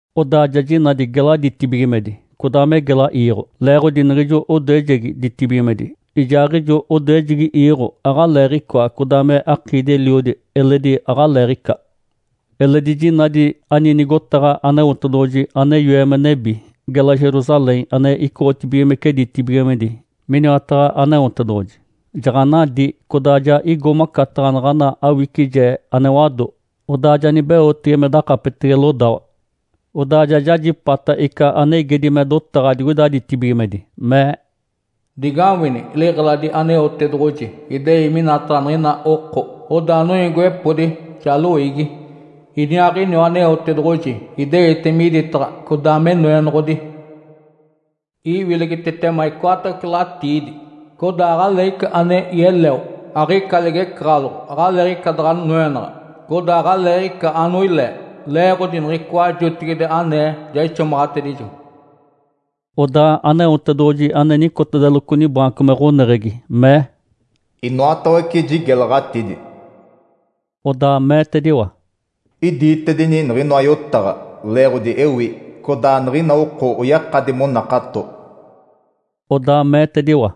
Odaa ja jinadi gela ditibigimedi codaa me gela iiɡ̶o. Leeɡ̶odi niɡ̶ijo odoejegi ditibigimedi, ijaaɡ̶ijo odoejegi iiɡ̶o aɡ̶aleeɡ̶icoa, codaa me akiidi-eliodi eledi aɡ̶aleeɡ̶ica. Eledi jinadi ani nigotaɡ̶a Aneotedoɡ̶oji ane yoe me nebi, gela Jerusalém, ane icoɡ̶otibigimece ditibigimedi miniwataɡ̶a Aneotedoɡ̶oji. Jaɡ̶anadí codaa ja igo macataɡ̶a naɡ̶ana awicije ane wado, odaa ja nibeotege me dakapetege lodawa. Odaa ja jajipata ica ane igedi me dotaɡ̶a digoida ditibigimedi, mee, “Digawini! Liɡ̶eladi Aneotedoɡ̶oji idei minataɡ̶a niɡ̶ina oko, odaa noiigiwepodi, ja loiigi. Iniaaɡ̶iniwa Aneotedoɡ̶oji ideite miditaɡ̶a, codaa me Noenoɡ̶odi. Iwilegitetema icoatawece latiidi. Codaa aɡ̶aleeɡ̶ica ane yeleo, aɡ̶ica ligecaɡ̶aloɡ̶o, aɡ̶aleeɡ̶ica daɡ̶a noenaɡ̶a, codaa aɡ̶aleeɡ̶ica anoilee. Leeɡ̶odi niɡ̶icoa jotigide anee ja ixomaɡ̶atedijo.” Odaa Aneotedoɡ̶oji ane nicotedeloco nibaanco me ɡ̶oneɡ̶egi mee, “Inoatawece jigelaɡ̶atidi.” Odaa meetediwa, “Idiitedini niɡ̶inoa yotaɡ̶a leeɡ̶odi ewi, codaa niɡ̶ina oko oyakadi monakato.” Odaa meetediwa,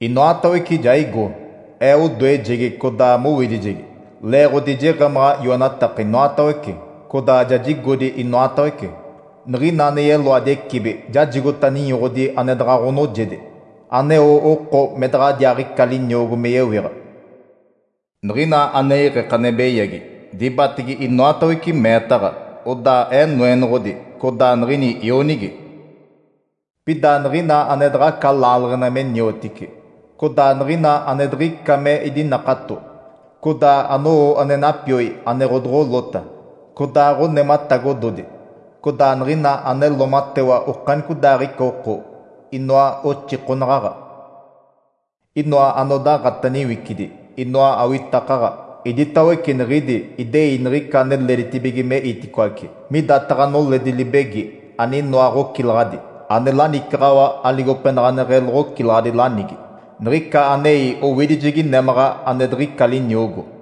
“Inoatawece ja igo. Ee odoejegi, codaa mowidijegi, leeɡ̶odi jeɡ̶emaɡ̶a yoenataka inoatawece, codaa ja jigodi inoatawece. Niɡ̶ina ane yeloadi ecibi jajigota ninyoɡ̶odi ane daɡ̶a ɡ̶onoojedi, aneo oko me daɡ̶adiaaɡ̶ica liniogo me yewiɡ̶a. Niɡ̶ina ane iɡ̶eke ane beyagi, dibatege inoatawece meetaɡ̶a. Odaa Ee Noenoɡ̶odi, codaa niɡ̶ini ionigi. Pida niɡ̶ina ane daɡ̶aca laaleɡ̶ena me niotici, codaa niɡ̶ina ane diɡ̶ica me idinakato, codaa anowo ane napioi ane ɡ̶odoɡ̶olota, codaa ɡ̶onematagododi, codaa niɡ̶ina ane loomatewa okanicodaaɡ̶ica oko, inoa oxikonaɡ̶aɡ̶a, inoa anodaaɡ̶ata niwicidi, inoa awitakaɡ̶a, iditawece niɡ̶idi idei niɡ̶ica ane leeditibige me iticoace midataɡ̶a noledi libegi aninoa ɡ̶ocilaɡ̶adi ane lanicaɡ̶awa aligopenaɡ̶aneɡ̶e loɡ̶ocilaɡ̶adi lanigi. Niɡ̶ica anei owidijegi némaɡ̶a ane diɡ̶ica liniogo.”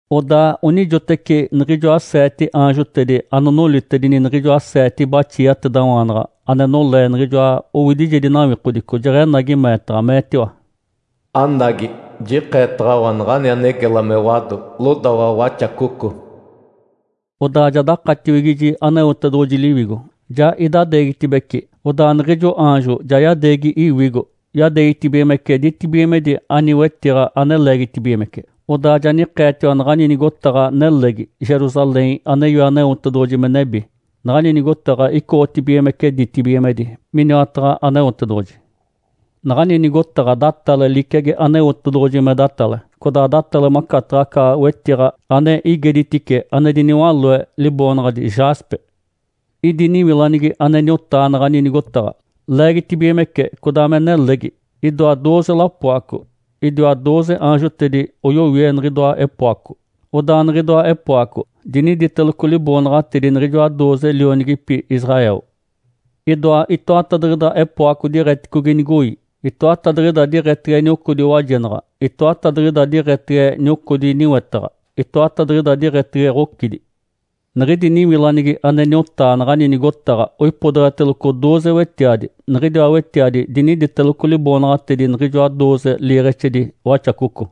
Odaa onijoteci niɡ̶ijoa seete aanjotedi anonolitedi niɡ̶ijoa seete baxiatedawaanaɡ̶a ane nolee niɡ̶ijoa owidijedi nawikodico jeɡ̶enagi meetaɡ̶a, meetiwa, “Anagi, jikeetaɡ̶awa naɡ̶ani ane gela me wado, lodawa Waxacoco.” Odaa ja dakatiwigiji Aneotedoɡ̶oji Liwigo, ja idadeegitibeci, odaa niɡ̶ijo aanjo ja yadeegi iwigo, yadeegitibigimece ditibigimedi ani wetiɡ̶a ane leegitibigimece. Odaa ja nikeetiwa naɡ̶ani nigotaɡ̶a nelegi, Jerusalém ane yoe Aneotedoɡ̶oji me nebi. Naɡ̶ani nigotaɡ̶a icoɡ̶otibigimece ditibigimedi miniwataɡ̶a Aneotedoɡ̶oji. Naɡ̶ani nigotaɡ̶a datale liciagi Aneotedoɡ̶oji me datale, codaa datale macataɡ̶a aca wetiɡ̶a ane igeditice ane diniwaloe, liboonaɡ̶adi “Jaspe”. Idi niwilanigi ane niotaa naɡ̶ani nigotaɡ̶a, leegitibigimece codaa me nelegi. Idoa dooze lapoaco, idiaa dooze aanjotedi oyowie niɡ̶idoa epoaco. Odaa niɡ̶idoa epoaco diniditeloco liboonaɡ̶atedi niɡ̶ijoa dooze lionigipi Israel. Idoa itoatadiɡ̶ida epoaco diɡ̶eticogi nigoi, itoatadiɡ̶ida diɡ̶etege niocodi wajenaɡ̶a, itoatadiɡ̶ida diɡ̶etege niocodi niwetaɡ̶a, itoatadiɡ̶ida diɡ̶etege ɡ̶ocidi. Niɡ̶idi niwilanigi ane niotaa naɡ̶ani nigotaɡ̶a oipodeɡ̶eteloco dooze wetiadi. Niɡ̶idiwa wetiadi diniditeloco liboonaɡ̶atedi niɡ̶ijoa dooze liiɡ̶exedi Waxacoco.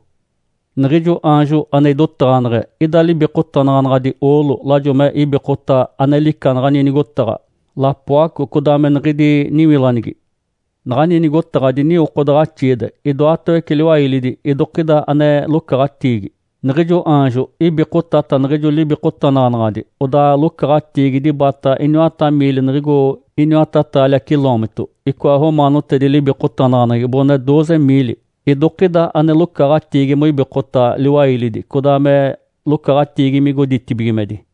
Niɡ̶ijo aanjo ane idotaɡ̶aneɡ̶e ida libikotanaɡ̶anaɡ̶adi oolo lajo me ibikota ane lica naɡ̶ani nigotaɡ̶a, lapoaco, codaa me niɡ̶idi niwilanigi. Naɡ̶ani nigotaɡ̶a diniwokodaɡ̶axiide, idoatawece liwailidi idokida ane locaɡ̶atiigi. Niɡ̶ijo aanjo ibikotata niɡ̶ijo libikotanaɡ̶anaɡ̶adi odaa locaɡ̶atiigi dibata iniwata miili niɡ̶igo iniwata taalia ciloomito (icoa romaanotedi libikotanaɡ̶aneɡ̶egi boɡ̶one dooze miili.) Idokida ane locaɡ̶atiigi moibikota liwailidi codaa me locaɡ̶atiigi migo ditibigimedi.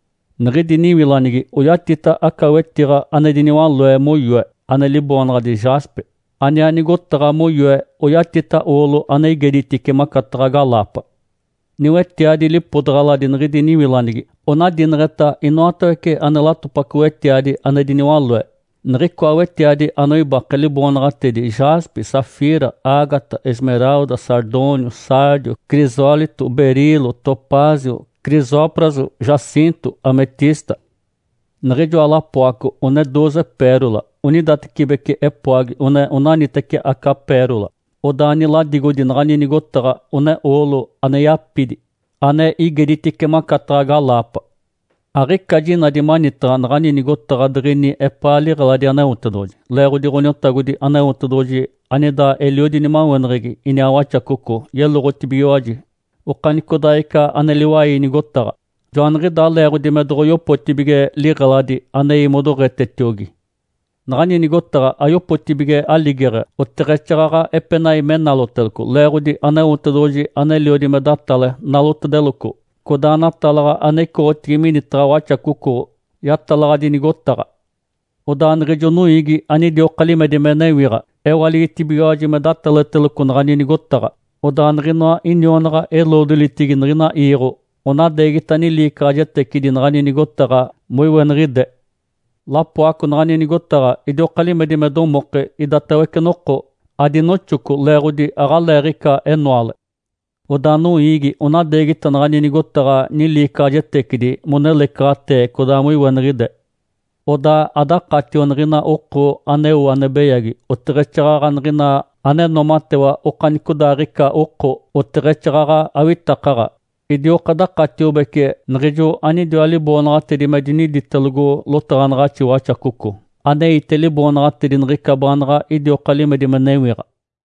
Niɡ̶idi niwilanigi oyatita aca wetiɡ̶a ane diniwaloe moyoe, ane liboonaɡ̶adi “Jaspe”, aniaa nigotaɡ̶a moyoe oyatita oolo ane igeditice macataɡ̶a galaapa. Niwetiadi lipodaɡ̶aladi niɡ̶idi niwilanigi onadineɡ̶eta inoatawece ane latopaco wetiadi ane diniwaloe. Niɡ̶icoa wetiadi anoibake, liboonaɡ̶atedi Jaspe, Safira, Ágata, Esmeralda, Sardônio, Sárdio, Crisólito, Berilo, Topázio, Crisópraso, Jacinto, Ametista. Niɡ̶ijoa lapoaco one dooze pérola. Onidatecibeci epoagi one onaniteci aca pérola. Odaa niladigodi naɡ̶ani nigotaɡ̶a one oolo ane yapidi, ane igeditice macataɡ̶a galaapa. Aɡ̶ica jinadi manitaɡ̶a naɡ̶ani nigotaɡ̶a diɡ̶ini epaa liɡ̶eladi Aneotedoɡ̶oji. Leeɡ̶odi Ǥoniotagodi Aneotedoɡ̶oji anida eliodi nimaweneɡ̶egi iniaa Waxacoco yeloɡ̶otibigiwaji okanicodaaɡ̶ica ane liwai nigotaɡ̶a. (Joaniɡ̶idaa leeɡ̶odi me doɡ̶oyopotibige liɡ̶eladi anei modoɡ̶etetiogi). Naɡ̶ani nigotaɡ̶a ayopotibige aligeɡ̶e oteɡ̶exaaɡ̶aɡ̶a epenai me naloteloco, leeɡ̶odi Aneotedoɡ̶oji aneliodi me datale, nalotedeloco, codaa natalaɡ̶a ane icoɡ̶otigi minitaɡ̶a Waxacoco yatalaɡ̶adi nigotaɡ̶a. Odaa niɡ̶ijo noiigi anidioka limedi me newiɡ̶a ewaligitibigiwaji me datalaɡ̶ateloco naɡ̶ani nigotaɡ̶a. Odaa niɡ̶inoa inionaɡ̶a-eloodolitigi niɡ̶ina iiɡ̶o onadeegita niliicaɡ̶ajetecidi naɡ̶ani nigotaɡ̶a moiweniɡ̶ide. Lapoaco naɡ̶ani nigotaɡ̶a idioka limedi me domoke idatawece noko. Adinoxoco leeɡ̶odi aɡ̶aleeɡ̶ica enoale. Odaa noiigi onadeegita naɡ̶ani nigotaɡ̶a niliicaɡ̶ajetecidi monelecaɡ̶atee codaa moiweniɡ̶ide. Odaa adakatio niɡ̶ina oko aneo ane beyagi, oteɡ̶exaaɡ̶aɡ̶a niɡ̶ina ane noomatewa okanicodaaɡ̶ica oko, oteɡ̶exaaɡ̶aɡ̶a awitakaɡ̶aɡ̶a. Idioka dakatiobece niɡ̶ijo anidiwa liboonaɡ̶atedi me diniditelogo lotaɡ̶anaɡ̶axi Waxacoco, aneite liboonaɡ̶atedi niɡ̶ica baanaɡ̶a idioka limedi me newiɡ̶a.